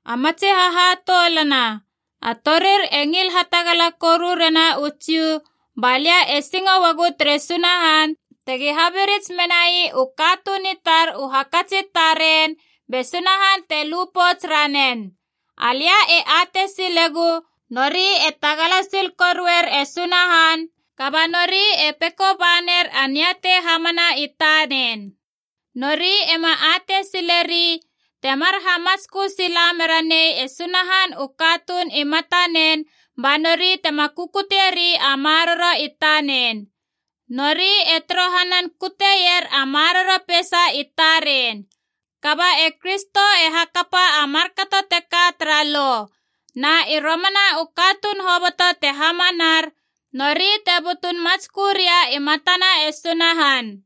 A matsi hahatoulana, a torir e ngil hatagala koru rena u Jiu, balia e singo uagu tere Sunahan tegi habirits menai u katuun i tar u hakats i taren be Sunahan te lu pouts ranen. Alia e atei silegu, nori e tagala sil koruer e Sunahan, kaba nori e peko ba ner a niatei hamana i tanen. Nori ema atei sileri temar hamatskö sila mera nei e Sunahan u katuun i matanen, ba nori tema kukutie ri a maroro i tanen. Nori e torohanan kuteier a maroro peisa i taren. Kaba e Kristo e hakapa a markato teka tara Lo. Na i romana u katuun hoboto te hamanar, nori te butun matskö ria i matana e Sunahan.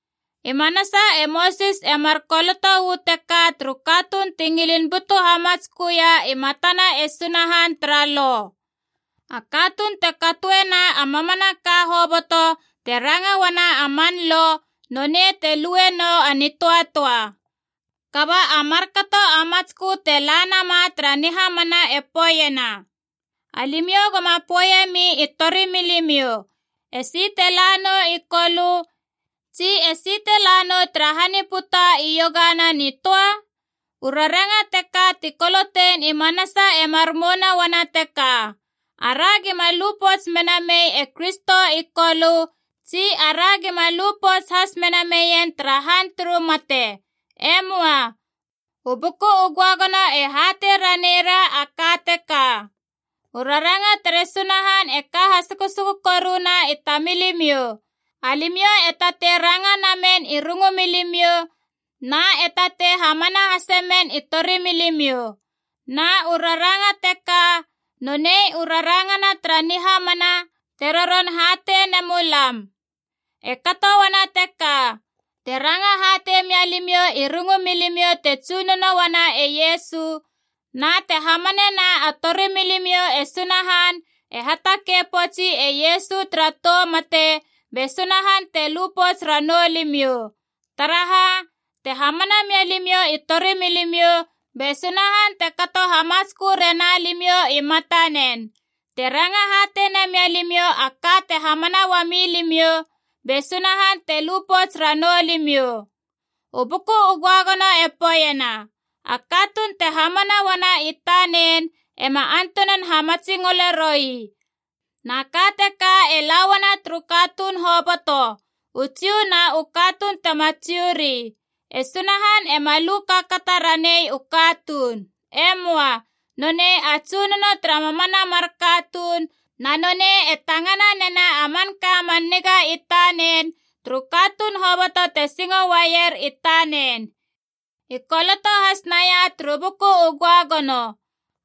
I manasa e Mosis e mar koloto uu teka turu katuun ti ngilin butu hamatsköia i matana e Sunahan tara Lo: “A katuun te katoena a mamanaka hoboto te ranga uana a man Lo, nonei te lue nou a nitöatöa.” Kaba a markato a matskö te la nama tara nihamana e poeiena, “Alimiou goma poeiemi i torimilimiou, ‘Esi te la nou i Kolö, tsi esi te la nou tara han i puta iogana nitöa?’” U raranga teka ti kolotein i manasa e mar mouna uana teka: ara gima lu pouts mena mei e Kristo i Kolö, tsi ara gima lu pouts has mena meien tara han turu mate. E möa! U Buku u Göagono e hatei ranei ra a ka teka: “U raranga tere Sunahan e ka hasukusuku koruna i tamilimiou. Alimiou e tatei ranga namen i rungu milimiou na e tatei hamana hase men i torimilimiou.” Na u raranga teka nonei u rangana tara nihamana te roron hatei nemulam. E kato uana teka: te ranga hatei mia limiou i rungu milimiou te Tsunono uana e Iesu, na te hamanena a torimilimiou e Sunahan e hatakei poutsi e Iesu tara tou mate, be Sunahan te lu pouts ranou limiou. Taraha, te hamana mia limiou i torimilimiou, be Sunahan te kato hamatskö rena limiou i matanen. Te ranga hatei namia limiou a ka te hamana uami limiou, be Sunahan te lu pouts ranou limiou. U Buku u Göagono e poeiena, “A katuun te hamana uana i tanen ema antunan hamatsingole roi.” Na ka teka e lauana turu katuun hoboto, u Jiu na u katuun tema Jiu ri. E Sunahan ema lu kaakata ranei u katuun. E möa. Nonei a Tsunono tara mamana mar katuun, na nonei e tangana nena a manka man niga i tanen turu katuun hoboto te singo uaier i tanen. I koloto has naia turu Buku u Göagono,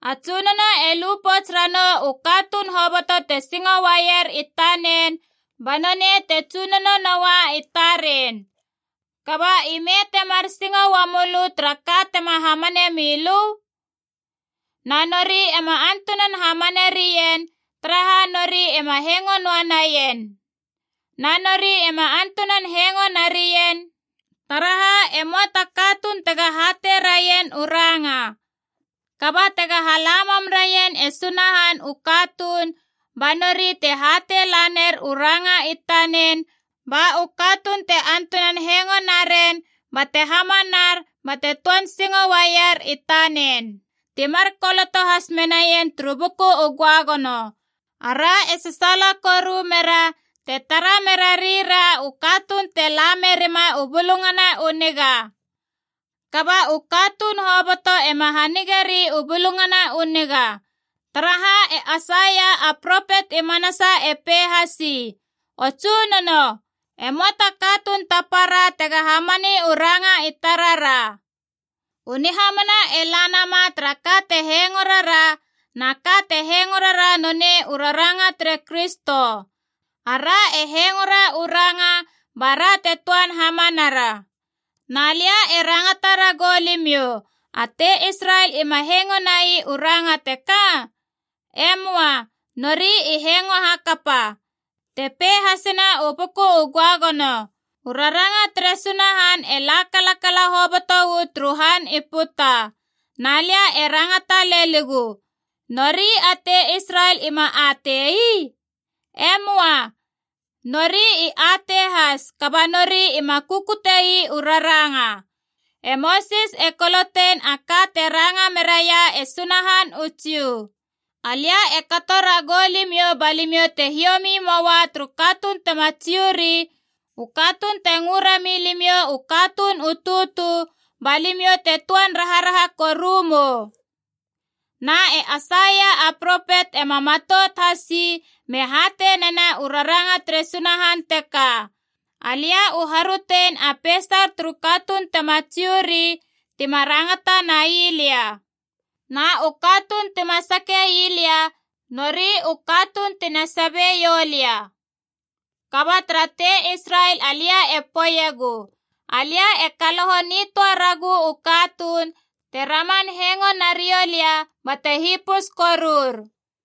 “A Tsunono e lu pouts ranou u katuun hoboto te singo uaier i tanen, ba nonei te Tsunono noa i taren.” Kaba ime temar singo uamölö tara ka tema hamane milö? Na nori ema antunan hamane rien, taraha nori ima hengo noa naien. Na nori ema antunan hengo narien, taraha e möa ta katuun tega hatei raien u ranga. Kaba tega hala mam raien e Sunahan u katuun ba nori te hatei laner u ranga i tanen, ba u katuun te antunan hengo naren bate hamanar bate töan singo uaier i tanen. Ti mar koloto has menaien turu Buku u Göagono: “Ara e sasaala koru mera te tara mera rira u katuun te la merima u Bulungana u Niga!” Kaba u katuun hoboto ema hanigeri u Bulungana u Niga. Taraha e Aisaia a propet i manasa e pei hasi, “O Tsunono, e möa ta katuun ta para tega hamani u ranga i tarara.” U nihamana e la nama tara ka te hengoe rara, na ka te hengoe rara nonei u raranga tere Kristo. Ara e hengoera u ranga, bara te töan hamanara. Na lia e rangata ragou limiou: a tei Israel ima hengo nai u ranga teka? E möa. Nori i hengo hakapa. Te pei hasena u Buku u Göagono: “U raranga tere Sunahan e la kalakala hoboto uu turu han i puta.” Na lia e rangata leligu, nori a tei Israel ima atei ii? E möa. Nori i atei has, kaba nori ima kukute ii u raranga. E Mosis e kolotein a ka teka te ranga meraia e Sunahan u Jiu: “Alia e kato ragou limiou ba limiou te hiomi moua turu katuun tema Jiu ri, u katuun te ngö rami limiou u katuun u tutu, ba limiou te töan raharaha koru mou.” Na e Aisaia a propet ema matout has ii me hatei nena u raranga tere Sunahan teka: “Alia u harötein a peisar turu katuun tema Jiu ri tima rangata nai lia. Na u katuun tima sake ii lia nori u katuun tina sabeiou lia.” Kaba tara tei Israel alia e poeiegu, “Alia e kaloho nitöa ragu u katuun te raman hengo nariou lia bate hipus korur.”